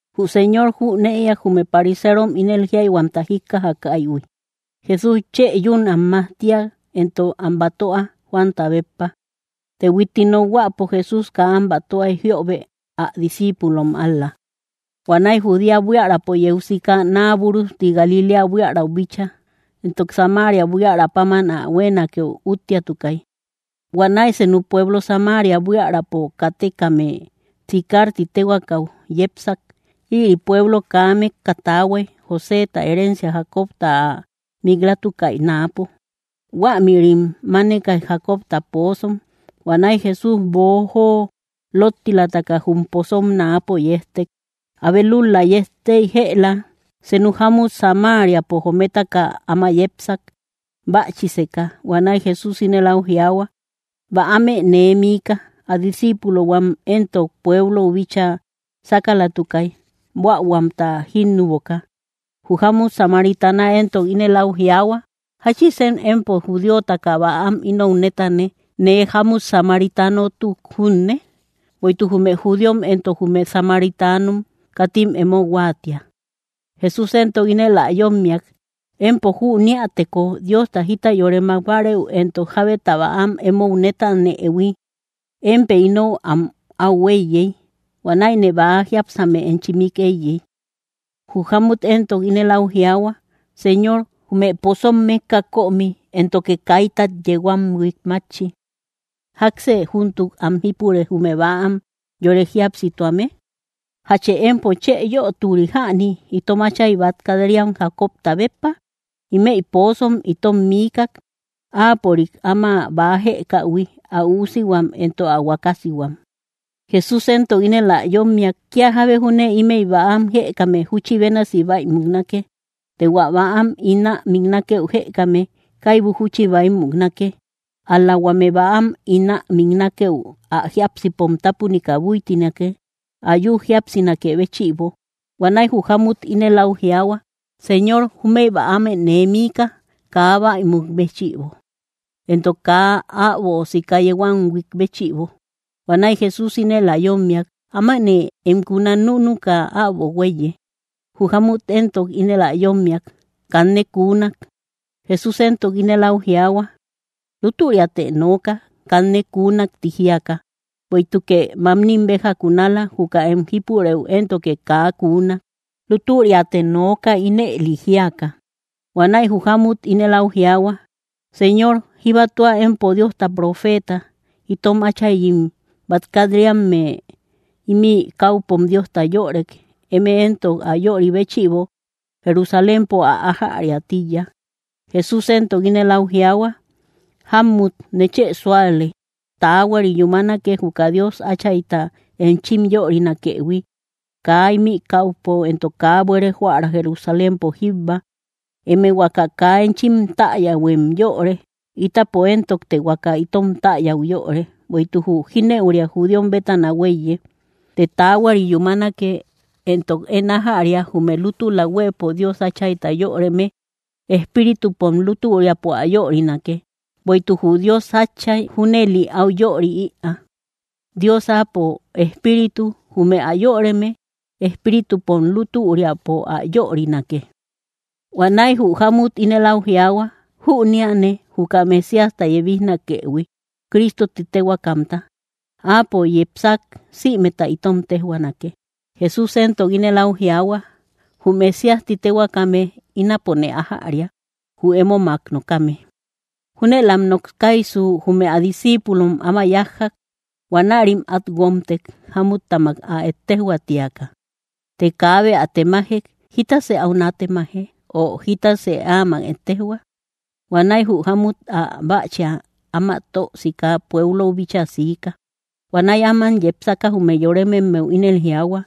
Jü Señor jünëiak jume pariserom ínel jíayhuamta jíkkajakaïhui: Jesús chë yún am majtia éntok am batöa, Juanta béppa. (Të huitti nokhuäpo, Jesús kaa am batöay jiöbe, ä discíipulom ál‑la.) Huanäi Judea buiärapo yeu siika, naa búrujti Galiléa buiärau bíchaa. Éntok Samaria buiära páman ä huéenakeu útteatukay. Huanäi senu pueblo Samaria buiärapo kátekame Sicar ti téhuaakäu yepsak. Ïri pueblo kaa mékka taahuay, Joséta herencia Jacobta ä mik‑latukaï náapo. Huämïrim mánekay Jacobta poozom. Huanäi Jesús, boojo lottilataka, jum pozom náapo yejtek. Abe lúl‑la yejtey jëla. Senu jámut Samariapo jometaka áma yepsak, bächiseka. Huanäi Jesús ínel áu jiaahua: —Bäamë nee miika. Ä disciipulohuam éntok pueblou bíchaa sákalatukay, buähuamta jínnuboka. Jü jámut samaritana éntok ínel áu jiaahua: —¿Jáchisen empo judíotaka bäam inou nétane, nee jámut samaritanotuk junne? (Bueïtuk jume judíom éntok jume samaritanom katim emo huáatia.) Jesús éntok ínel ä yómmiak: —Empo jüneäteko Diosta jita yore mák bárëu éntok jábeta bäam emou nétanëhui, émpë inou am au éiyey. Huanäine bäa jiápsame enchi mik éiyey. Jü jámut éntok ínel áu jiaahua: —Señor, jume pozom mékka kömi, éntoke kaitay yeu am huík mátchi. ¿Jáksë júntuk am jípure, jume bäam yore jíapsituame? ¿Jachë empo chë yöturi jäni, itom áchay bát kat‑riam Jacobta béppa? Ímëi pozom itom miikak, áapörik áma bäa jëkähui, ä üusihuam éntok ä huakasihuam. Jesús éntok ínel ä yómmiak: —Kía jábe júne ímëi bäam jëkame, júchi bénasi bäi muknake; të hua bäam ín ä miknakeu jëkame, kaibu júchi bäi muknake, ál‑la huame bäam ín ä miknakeu, ä jiápsipom tápunika búitinake, ä yü jíapsinakë béchïbo. Huanäi jü jámut ínel áu jiaahua: —Señor, júmëi bäamë nee miika, kaa bäi muk béchïbo éntok kaa äbo sika yeu am huík béchïbo. Huanäi Jesús ínel ä yómmiak: —Ámanë em kuna núnuka, äbo huéiye. Jü jámut éntok ínel ä yómmiak: —Kanne kuunak. Jesús éntok ínel áu jiaahua: —Lútüriatë nooka, kanne kuunak ti jíaka; bueïtukë mamnim béja kunala; juka én em jípurëu éntoke kaa kuunak. Lútüriatë nooka, ínëli jíaka. Huanäi jü jámut ínel áu jiaahua: —Señor, jíbatua empo Diosta profeeta. Itom áchayim bát kat‑riame ímï káupom Diosta yörek; eme éntok ä yöri béchïbo, Jerusalémpo ä ájariä tíiya. Jesús éntok ínel áu jiaahua: —Jámmut, nechë súale, taahuari yúmanake, juka Dios Áchayta enchim yörinakëhui, kaa ímï káupo, éntok kaa buere joära Jerusalémpo jíbba. Eme huaka kaa enchim täyähuem yöre; ítapo éntokte huaka itom täyäu yöre, bueïtuk jü jínëuria judíom bétana huéiye. Të taahuari yúmanake, éntok én ájäria: jume lútula huëpo Dios Áchayta yöreme, espíritupom lútüriapo ä yörinake; bueïtuk jü Dios Átchay junëli áu yöri ïaa. Dios Áapo Espíritu. Jume ä yöreme, espíritupom lútüriapo ä yörinake. Huanäi jü jámmut ínel áu jiaahua: —Jüneane juka Mesíasta yebijnakëhui, Cristo ti téhuaakamta. Áapo yepsak, sïmeta itom téjhuaanake. Jesús éntok ínel áu jiaahua: —Jü Mesías ti téhuaakame, ínapone ájäria, jü émomak nokame. Júnëlam nokaysu, jume ä discíipulom áma yájjak. Huanärim át guómtek, jámuttamak ä ettejoä tíaka. Të kaabe ä temajek: “¿Jítasë áu nátemaje?” o, “¿Jítasë áamak ettejhua?” Huanäi jü jámmut, ä bächia áma tö sika, pueblou bíchaa siika. Huanäi áman yepsaka, jume yorememmeu ínel jiaahua: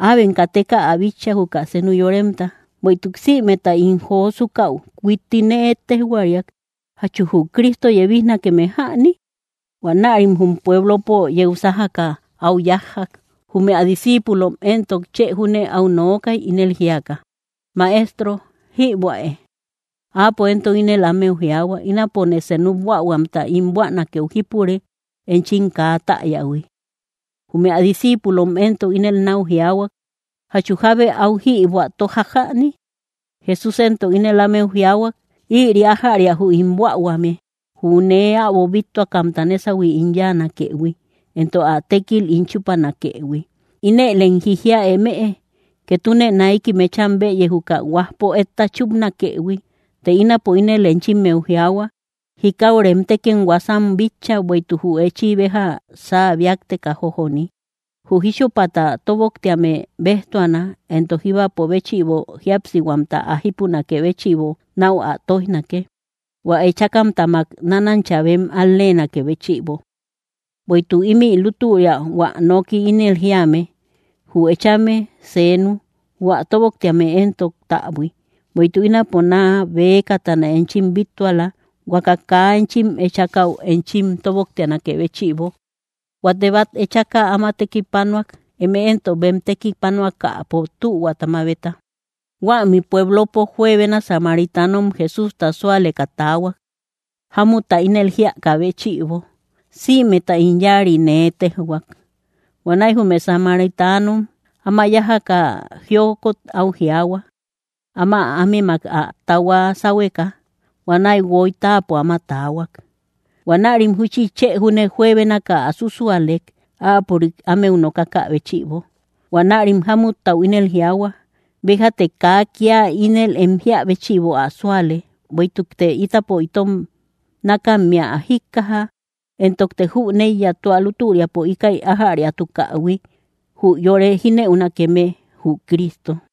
—Äbem kateka ä bitcha, juka senu yoremta. ¡Bueïtuk sïmeta ín josukäu huitti nee ettejhuariak! ¿Jachu jü Cristo yebijnakeme jäni? Huanärim jum pueblopo yeu sájaka áu yájjak. Jume ä discíipulom éntok chë júne áu nookay, ínel jíaka: —Maestro, jïbuäe. Áapo éntok ínel ámeu jiaahua: —Ínapo senu buähuamta ín buänakeu jípure, enchim kaa täyähui. Jume ä discíipulom éntok ínel náu jiaahuay: —¿Jachu jábe áu jïbuä tójak jäni? Jesús éntok ínel ámeu jiaahuak: —Ïri ájäria jü ín buähuame: jü nee äbo bíttuakamta nésahui ín yáanakëhui, éntok ä tékil ín chúpanakëhui. Inëlem jijia emëe: “Ketune naiki mecham bëye, juka huajpo etta chúpnakëhui.” Të ínapo ínel enchimmeu jiaahua, jikau remtekem huasam bitcha, bueïtuk jü echi béja saa bíakteka jójoni. Jü jíchupata tóboktéame béjtuana, éntok jíbapo béchïbo jíapsihuamta ä jípunakë béchïbo náu ä tóijnake, hua echákamtamak nánancha bem al‑leenakë béchïbo. Bueïtuk ímï lútüria hua noki ínel jíame: “Jü echame seenu, jü ä tóboktéame éntok, täbui.” Bueïtuk ínapo naa bëkatana enchim bíttuala, huaka kaa enchim echakäu enchim tóboktianakë béchïbo. Huate bát echaka áma tekipanuak, eme éntok bem tekipanuakäpo tühuata mabeta. Huämi pueblopo juebena samaritanom Jesústa súaleka taahuak, jámutta ínel jíakä béchïbo: “Sïmeta ín yáari nee téjhuak.” Huanäi jume samaritanom áma yájaka jiokot áu jiaahua, áma ámemak ä tahua sáhueka. Huanäi guoy táapo áma taahuak. Huanärim júchi chë júne juebénaka ä súsualek, áapörik ámeu nokakä béchïbo. Huanärim jámuttau ínel jiaahua: —Béjate kaa kía ínel em jíä béchïbo ä súale, bueïtukte ítapo itom nákammea ä jíkkaja, éntokte jüneiya tua lútüriapo íkäi ájäriatukähui, jü yore jínëunakeme, jü Cristo.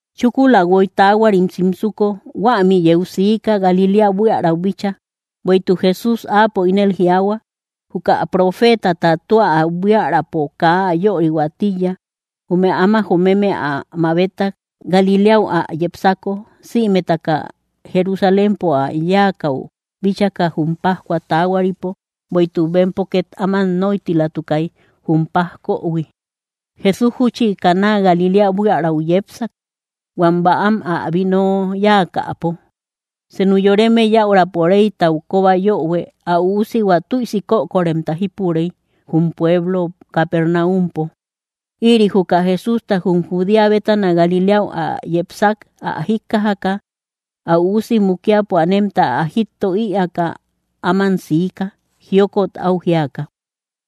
Chúkula guoy taahuarim simsuko, huämi yeu siika, Galiléa buiärau bíchaa. Bueïtuk Jesús áapo ínel jiaahua, juka profeetata tua ä buiärapo, kaa ä yörihuä tíiya. Jume áma jomeme ä mabetak, Galiléau ä yepsako, sïmetaka Jerusalémpo ä yáakäu bíchaka jum pájcua taahuaripo, bueïtuk bempo két áman nóitilatukay, jum pajkohui. Jesús júchi Caná Galiléa buiärau yepsak, huam bäam ä vino yáakäpo. Senu yoreme yäurapo reytau kóba yöhue, ä üusihua tüisi kökoremta jípurey, jum pueblo Capernaumpo. Ïri juka Jesústa jum Judea bétana Galiléau ä yepsak ä jíkkajaka, ä üusi mukiapo anemta ä jítto ïaaka áman siika, jiokot áu jíaka.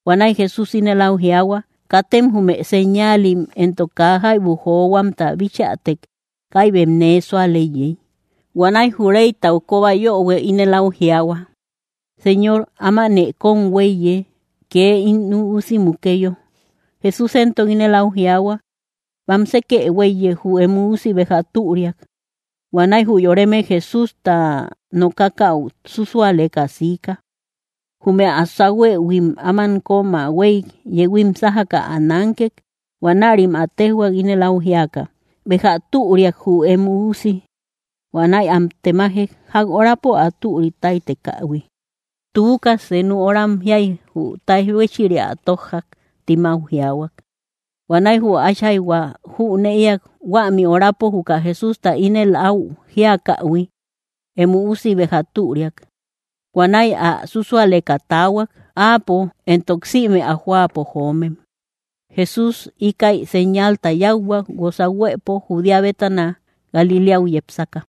Huanäi Jesús ínel áu jiaahua: —Katem jume señaalim éntok kaa jaibu johuamta bichätek, kaibem nee súal éiyey. Huanäi jü reytau kóba yöhue ínel áu jiaahua: —Señor, ámanë kóm huéiye, kee ín üusi mukeyo. Jesús éntok ínel áu jiaahua: —Bamsekë huéiye, jü em üusi béja türiak. Huanäi jü yoreme Jesústa nokakäu súsualeka siika. Jume ä sáhuëhuim áman kömä huéy, yehuim sájaka ä nánkek. Huanärim ä téjhuak, ínel áu jíaka: —¡Béja türiak, jü em üusi! Huanäi am temajek, ják horapo ä türi táytekähui. —Tuuka, senu horam jíay jü táij huéchiria ä tójjak —tim áu jiaahuak. Huanäi jü ä áchayhua jünëiak huämi horapo juka Jesústa ínel áu jíakähui: “Em üusi béja türiak.” Huanäi ä súsualeka taahuak, áapo, éntok sïme ä jóapo joomem. Jesús íkäi señalta yáuhuak, guosa huëpo Judea bétana Galiléau yepsaka.